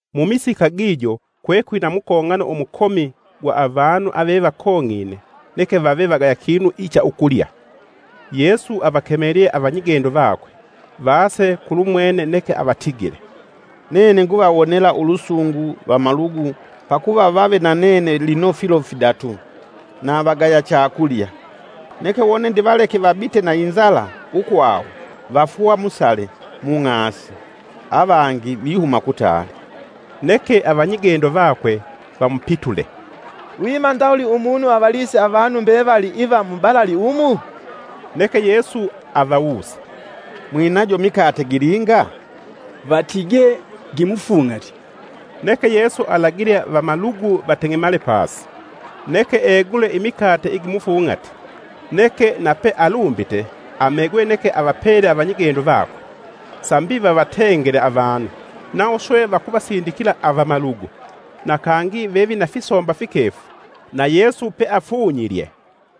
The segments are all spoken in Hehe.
Mumisika gijo lula, kwekwina mukong'ano umukomi gwa avanu avevakong'ine neke vave vagaya kinu ichaukulya, Yesu avakemelye avanyigendo vakwe vase kulumwene neke avatigile, “Nene nguvawonela ulusungu vamalugu pakuva vave na nene lino filo fidatu, na vagaya chakulya. Neke wone ndivaleke vabite na inzala ukwawo vafwa musale mung'asi, avangi vihuma kutaali.” Neke avanyigendo vakwe vamupitule, “Lwima ndawuli umunu avalise avanu mbevali iva mubalali umu?” Neke Yesu avawuse, “Mwinajo mikate gilinga?” “Vatigee gimufung'ati.” Neke Yesu alagile vamalugu vateng'emale pasi. Neke egule imikate igimufung'ati, neke nape alumbite amegwe neke avapele avanyigendo vakwe, sambi vavatengele avanu, nawo swe vakuvasindikila avamalugu. Na kangi vevina fisomba fikefu na Yesu peafunlye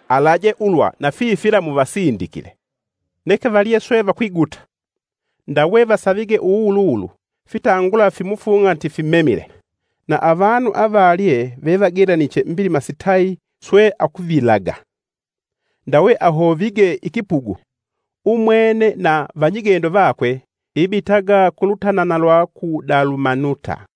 alaje ulwa na fifila muvasindikile. Neke valye swe vakwiguta. Ndawe vasavige uwuwuluwulu fitangula fimufung'ati fimemile. Na avanu avalye vevagelaniche mbilima sitayi swe akuvilaga, ndawe ahovige ikipugu, umwene na vanyigendo vakwe ibitaga ku lutanana lwa ku Dalumanuta.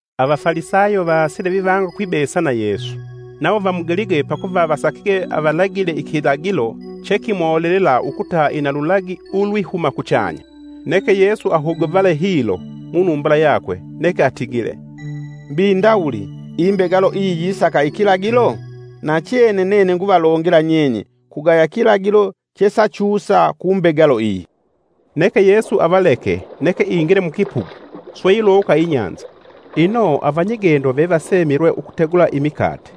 Avafalisayo vaasile vivanga ukwibesa na Yesu. Nawo vamugelige, pakuva vasakige avalagile ikilagilo chekimolelela ukuta ina lulagi ulwihuma kuchanya. Neke Yesu ahuguvale hilo munumbula yakwe neke atigile, “Mbi ndawuli, imbegalo iyi yisaka ikilagilo? Nachene nene nguvalongela nyenye kugaya kilagilo chesachusa kumbegelo iyi.” Neke Yesu avaleke neke ingile mukipugu swe ilowoka inyanza. Ino avanyigendo vevasemilwa ukutegula imikate,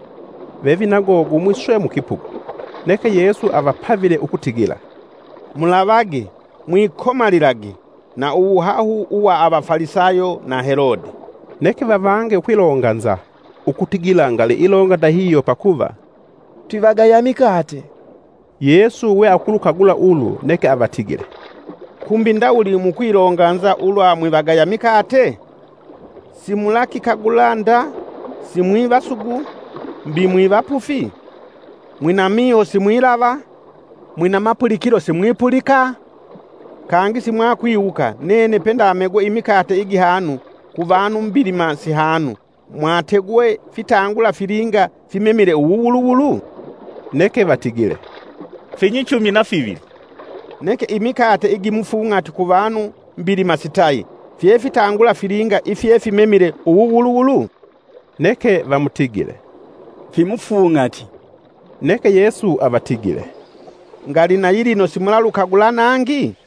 vevinago gumwi swe mukipugu. Neke Yesu avapavile ukutigila, “Mulavage! Mwikomalilage! na uwuhahu uwa Avafalisayo na Helodi.” Neke vavange ukwilonganza ukutigila ngali ilonga ndahihyo pakuva, “Twivagaya mikate.” Yesu we akulukagula ulu neke avatigile, “Kumbi ndawuli mukwilonganza ulwa mwivagaya mikate? Simulakikagula nda, simwivasugu, mbi mwivapufi? Mwina miho simwilava? Mwina mapulikilo simwipulika? Kangi simwakwiwuka nene pendamegwe imikate igihanu kuvanu mbilima sihanu mwategwe fitangula filinga fimemile uwuwuluwulu?” Neke vatigile, “Finyichumi na fivili.” “Neke imikate igimufung'ati kuvanu mbilima sitayi fyefitangula filinga ifye fimemile uwuwuluwulu?” Neke vamutigile, “Fimufung'ati.” Neke Yesu avatigile, “Ngali na yilino simulalukagula nangi?”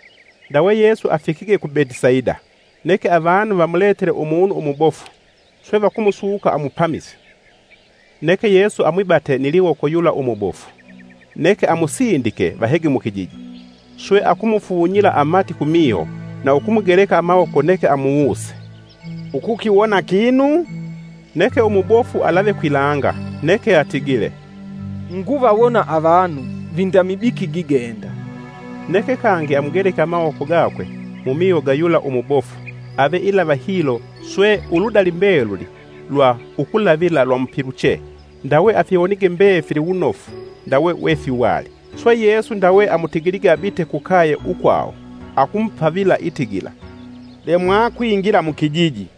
Ndawe Yesu afikige ku Betisaida. Neke avanu vamuletele umunu umubofu, swe vakusuka amupamise. Neke Yesu amwibate ni liwoko yula umubofu, neke amusindike vahege mukijiji. Swe akumufunyila amati kumiho na ukumugeleka amawoko neke amuwuse, “Ukukiwona kinu?” Neke umubofu alave kwilanga neke atigile, “Nguvawona avanu, vinda mibiki gigenda.” Neke kangi amugeleke amawoko gakwe mumiho ga yula umubofu ave ilava hilo swe uludali mbeluli lwa ukulavila lwamupiluche ndawe afiwonige mbefili wunofu ndawe wefiwali. Swe Yesu ndawe amutigilige abite kukaye ukwawo, akumupavila itigila, “Lemwa kwingila mukijiji!”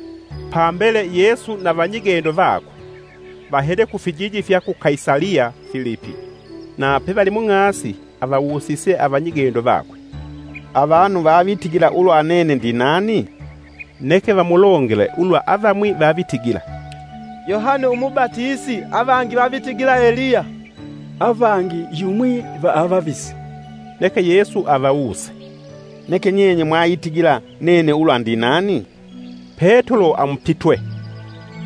Pambele Yesu na vanyigendo vakwe vahele kufijiji fya ku Kaisaliya Filipi. Na pevali mung'asi, avawusise avanyigendo vakwe, “Avanu vavitigila ulwa nene ndinani?” Neke vamulongele ulwa avamwi vavitigila, “Yohane umubatisi, avangi vavitigila Eliya, avangi yumwi va avavisi.” Neke Yesu avawuse, “Neke nyenye mwaitigila nene ulwa ndinani?” Petulo amupitwe,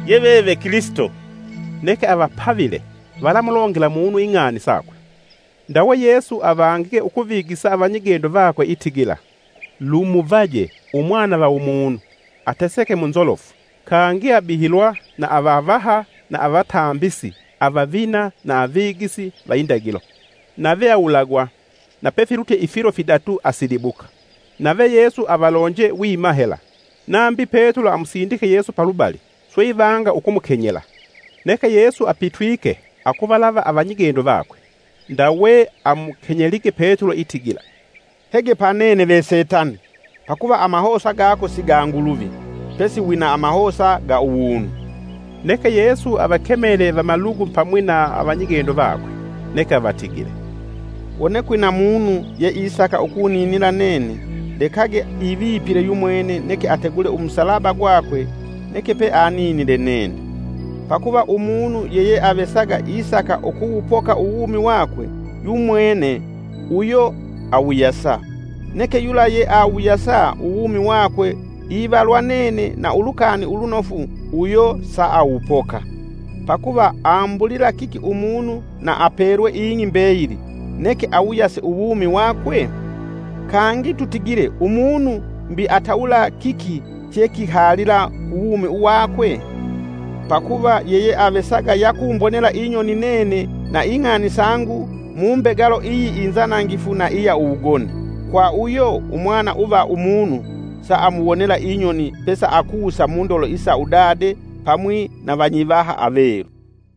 “Yeveve Kilisito.” Neke avapavile valamulongela munu ing'ani sakwe. Ndawe Yesu avangige ukuvigisa avanyigendo vakwe itigila, “Lumuvaje Umwana va Umunu ateseke munzolofu, kangi abihilwa na avavaha na avatambisi avavina na avigisi va indagilo. Nave awulagwa, na pefilutye ifilo fidatu asilibuka.” Nave Yesu avalonje wima hela. Nambi Petulo amusindike Yesu palubali swe ivanga ukumukenyela. Neke Yesu apitwike akuvalava avanyigendo vakwe, ndawe amukenyelige Petulo itigila, “Hege pa nene ve setani! Pakuva amahosa gako si ga Nguluvi, pesi wina amahosa ga uwunu.” Neke Yesu avakemele vamalugu pamwi na vanyigendo vakwe, neke avatigile, “Wone kwina munu yeisaka ukuninila nene lekage ivipile yumwene neke ategule umusalaba gwake neke peaninile nene. Pakuva umunu yeyeavesaga isaka ukuwupoka uwumi wakwe yumwene, uyo awuyasa, neke yula yeawuyasa uwumi wakwe ivalwa nene na Ulukani Ulunofu uyo saawupoka. Pakuva ambulila kiki umunu na apelwe ing'i mbeyili neke awuyase uwumi wakwe? Kangi tutigile umunu mbi atawula kiki chekihalila ku uwumi wakwe? Pakuva yeyeavesaga yakumbonela inyoni nene na ing'ani sangu mu mbegalo iyi inzanangifu na iya uwugoni, kwa uyo Umwana uva Umunu saamuwonela inyoni pesaakusa mundolo isa udade pamwi na vanyivaha avelu.”